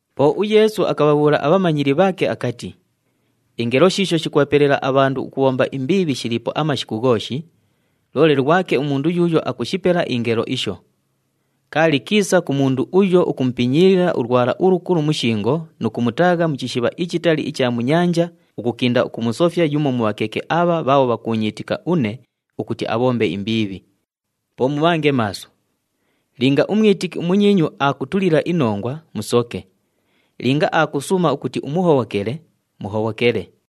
Po uYeesu akabhabhuula abhamanyili bhaake akati, “Ingelo shiisho shikubhapelela abhandu ukubhomba imbiibhi shiliipo amashiku ghooshi, loole lwake umundu yuuyo akushipela ingelo isho! Kaali kiisa ku mundu uyo ukumupinyiilila ulwala ulukulu mu shingo nu kumutaagha mu chishibha ichitali icha mu nyanja ukukinda ukumusofya yumo mu bhakeke abha bhaabho bhakuunyiitika une ukuti abhombe imbiibhi. Po mubhange maaso. Linga umwitiki umunyiinyu aakutulila inongwa, musoke. Linga akusuuma ukuti umuhobhokele, muhobhokele.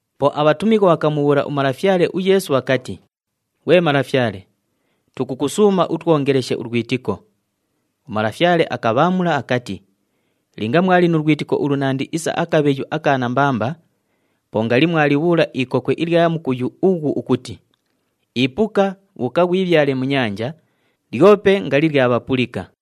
Po abhatumighwa bhakamubhuula uMalafyale uYeesu bhakati, “Ghwe Malafyale, tukukusuuma utwongeleshe ulwitiko!” UMalafyale akabhaamula akati, “Linga mwali nu lwitiko ulunandi isa akabheyu aka nambamba, po ngali mwalibhuula ikokwe ilya mukuyu ughu ukuti, ‘Ipuka, bhuuka ghwibhyale mu nyanja!’ Lyope ngali lyabhapulika.”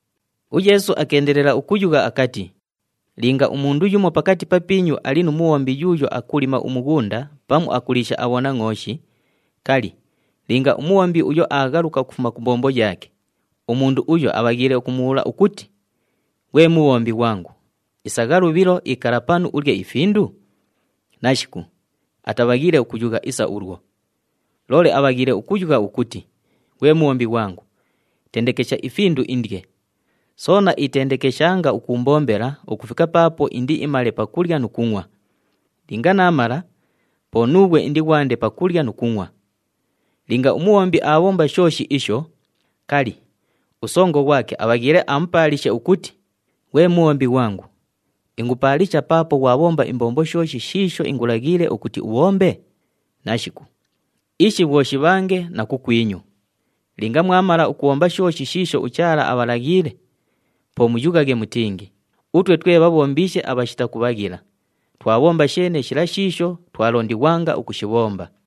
UYeesu akeendelela ukuyugha akati, “Linga umundu yumo pakati papiinyu ali nu mubhombi yuuyo akulima umughunda pamu akuliisha abhonangʼooshi, kali, linga umubhombi uyo aaghaluka ukufuma ku mbombo yaake, umundu uyo abhaghiile ukumubhuula ukuti, ‘Ghwe mubhombi ghwangu, isagha lubhilo, ikala panu, ulye ifindu’? Nashiku, atabhaghiile ukuyugha isa ulwo! Loole abhaghiile ukuyugha ukuti, ‘Ghwe mubhombi ghwangu, tendekesha ifindu indye, soona itendekeshanga ukuumbombela ukufika paapo indiimale pakulya nu kungʼwa. Linga naamala, po nuughwe indighwande pakulya nu kungʼwa.’ Linga umubhombi aabhomba shooshi isho, kali, usongo ghwake abhaghiile amupaalishe ukuti, ‘Ghwe mubhombi ghwangu, ingupaalisha paapo ghwabhomba imbombo shooshi shiisho ingulaghiile ukuti ubhombe’? Nashiku! Ishi bhwo shibhange na kukwinyu, linga mwamala ukubhomba shooshi shiisho uChaala abhalaghiile, po muyughaghe mutingi, ‘Utwe twe bhabhombiishe abhashita kubhaghila, twabhomba sheene shila shiisho twalondighwanga ukushibhomba.’”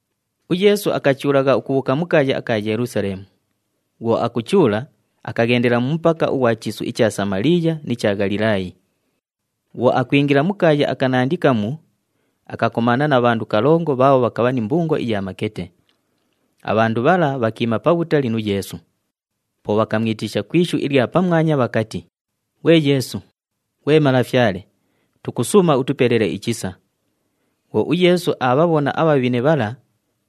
UYeesu akachuulagha ukubhuuka mu kaaya aka Yelusaleemu. Bhwo akuchuula, akaghendela mu mupaka ughwa chiisu icha Samaliiya ni cha Ghalilaayi. Bhwo akwingila mu kaaya akanandi kamu, akakomaana na bhandu kalongo bhaabho bhakabha ni mbungo iya makete. Abhandu bhala bhakiima pabhutali nu Yeesu. Po bhakamwitisha ku ishu ilya pamwanya bhakati, “Ghwe Yeesu, ghwe Malafyale, tukusuuma utupelele ichisa!” Bhwo uYeesu aabhabhona abhabhine bhala,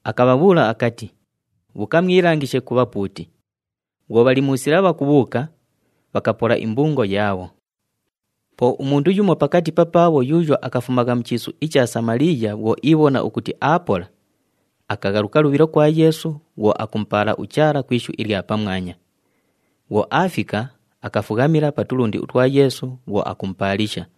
akabhabhuula akati, “Bhuuka mwilangishe ku bhapuuti.” Bhwo bhali mu sila bhakubhuuka, bhakapola imbungo yaabho. Po umundu yumo pakati papaabho yuuyo akafumagha mu chiisu icha Samaliiya bhwo iibhona ukuti aapola, akaghaluka lubhilo kwa Yeesu bhwo akumupaala uChaala ku ishu ilya pamwanya. Bhwo aafika, akafughamila pa tulundi utwa Yeesu bhwo akumupaalisha.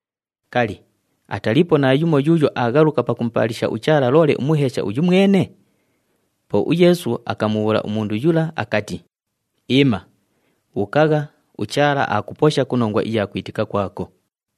Kali, ataliipo naayumo yuuyo aaghaluka pakumupaalisha uChaala, loole umuheesha uyu mwene?” Po uYeesu akamubhuula umundu yula akati, “Iima, bhuukagha, uChaala aakuposha ku nongwa iya kwitika kwako.”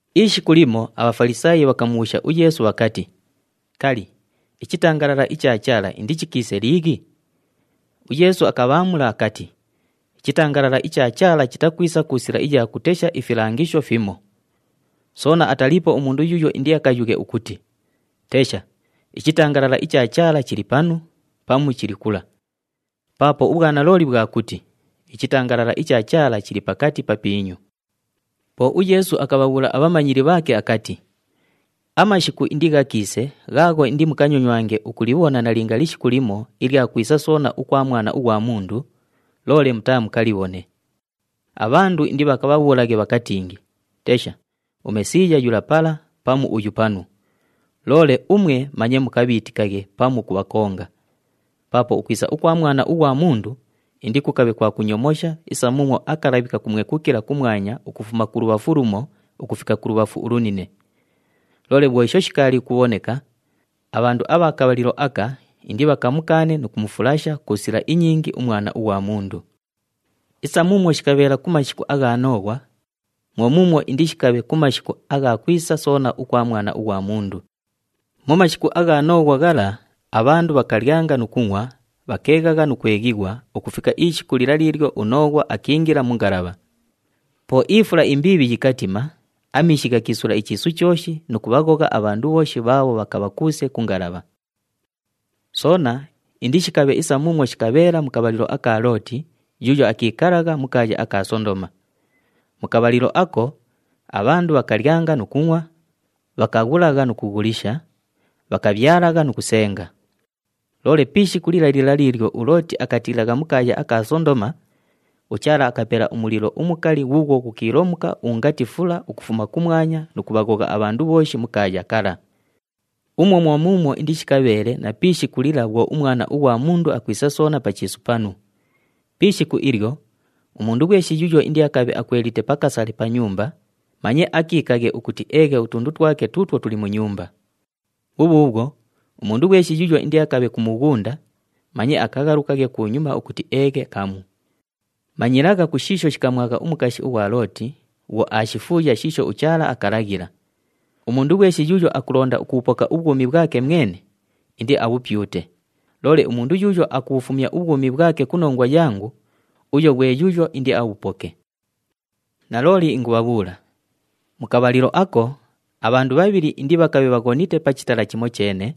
Ishiku limo aBhafalisaayi bhakamubhuusha uYeesu bhakati, “Kali, ichitangalala icha Chaala indichikiise liighi?” UYeesu akabhaamula akati, “Ichitangalala icha Chaala chitakwisa ku sila iya kutesha ifilangisho fimo. Soona ataliipo umundu yuuyo indiakayughe ukuti, ‘Tesha! Ichitangalala icha Chaala chili panu!’ pamu, ‘Chili kula!’ Paapo ubhwanalooli bhwa kuti ichitangalala icha Chaala chili pakati papiinyu.” Po uYeesu akabhabhuula abhamanyili bhaake akati, “Amashiku indighakiise ghaagho indimukanyonywange ukulibhona nalinga lishiku limo ilya kwisa soona ukwa Mwana ughwa Mundu, loole mutaamukalibhone. Abhandu indibhakabhabhuulaghe bhakatingi, ‘Tesha, uMesiiya yula pala!’ pamu, ‘Uyu panu!’ Loole umwe manye mukabhiitikaghe pamu ukubhakonga. Paapo ukwisa ukwa Mwana ughwa Mundu indikukabhe kwa kunyomosha isa muumwo akalabhi kakumwekukila kumwanya ukufuma kulubhafu lumo ukufika kulubhafu ulunine. Loole bhwo isho shikaali ukubhoneka, abhandu abha kabhalilo aka indibhakamukaane nu kumufulasha ku sila inyingi uMwana ughwa Mundu. “Isa muumwo shikabheela ku mashiku agha Nooghwa, mwo muumwo indishikabhe ku mashiku agha kwisa soona ukwa Mwana ughwa Mundu. Mu mashiku agha Nooghwa ghala, abhandu bhakalyanga nu kungʼwa, bhakeeghagha nu kweghighwa ukufika ishiku lila liilyo uNooghwa akiingila mu ngalabha. Po ifula imbiibhi yikatima, amiishi ghakiisula ichiisu chooshi nu kubhaghogha abhandu bhooshi bhaabho bhakabha kuuse ku ngalabha. “Soona indishikabhe isa muumwo shikabheela mu kabhalilo aka Looti yuuyo akiikalagha mu kaaya aka Sondoma. Mu kabhalilo ako, abhandu bhakalyanga nu kungʼwa, bhakaghulagha nu kughulisha, bhakabhyalagha nu kusenga. Loole pi ishiku lila lila liilyo uLooti akatiilagha mu kaaya aka Sondoma, uChaala akapela umulilo umukali ghuughwo ghukiilomuka ungati fula ukufuma kumwanya nu kubhaghogha abhandu bhooshi mu kaaya kala. Umwo mwo muumwo indishikabheele na pi ishiku lila bhwo uMwana ughwa Mundu akwisa soona pa chiisu panu. Pi ishiku ilyo, umundu ghweshi yuuyo indiakabhe akwelite pa kasale pa nyumba, manye akiikaghe ukuti eeghe utundu twake tuutwo tuli mu nyumba. Bhubhuubhwo, umundu ghweshi yuuyo indiakabhe ku mughunda, manye akaghalukaghe kunyuma ukuti eeghe kamu. Manyilagha ku shiisho shikamwagha umukashi ughwa Looti bhwo aashifuuya shiisho uChaala akalaghila. Umundu ghweshi yuuyo akulonda ukubhupoka ubhwumi bhwake mwene, indiabhupyute. Loole umundu yuuyo akubhufumya ubhwumi bhwake ku nongwa yangu, uyo ghwe yuuyo indiabhupoke. “Nalooli ingubhabhuula, mu kabhalilo ako, abhandu bhabhili indibhakabhe bhaghonite pa chitala chimocheene,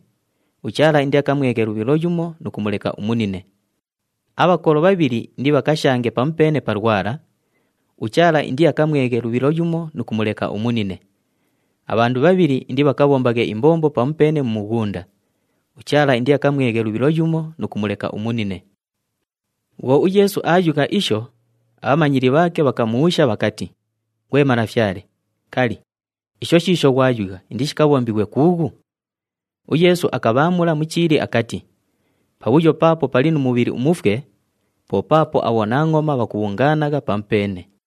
uChaala indiakamweghe lubhilo yumo nu kumuleka umunine. Abhakolo bhabhili indibhakashange pamupeene pa lwala, uChaala indiakamweghe lubhilo yumo nu kumuleka umunine. [ Abhandu bhabhili indibhakabhombaghe imbombo pamupeene mu mughunda, uChaala indiakamweghe lubhilo yumo nu kumuleka umunine.]” Bhwo uYeesu aayugha isho, abhamanyili bhaake bhakamubhuusha bhakati, “Ghwe Malafyale, kali, isho shiisho ghwayugha indishikabhombighwe kuughu?” UYeesu akabhaamula mu chiili akati, “Pabhuyo paapo pali nu mubhili umufwe, po paapo abhonangʼoma bhakubhungaanagha pamupeene.”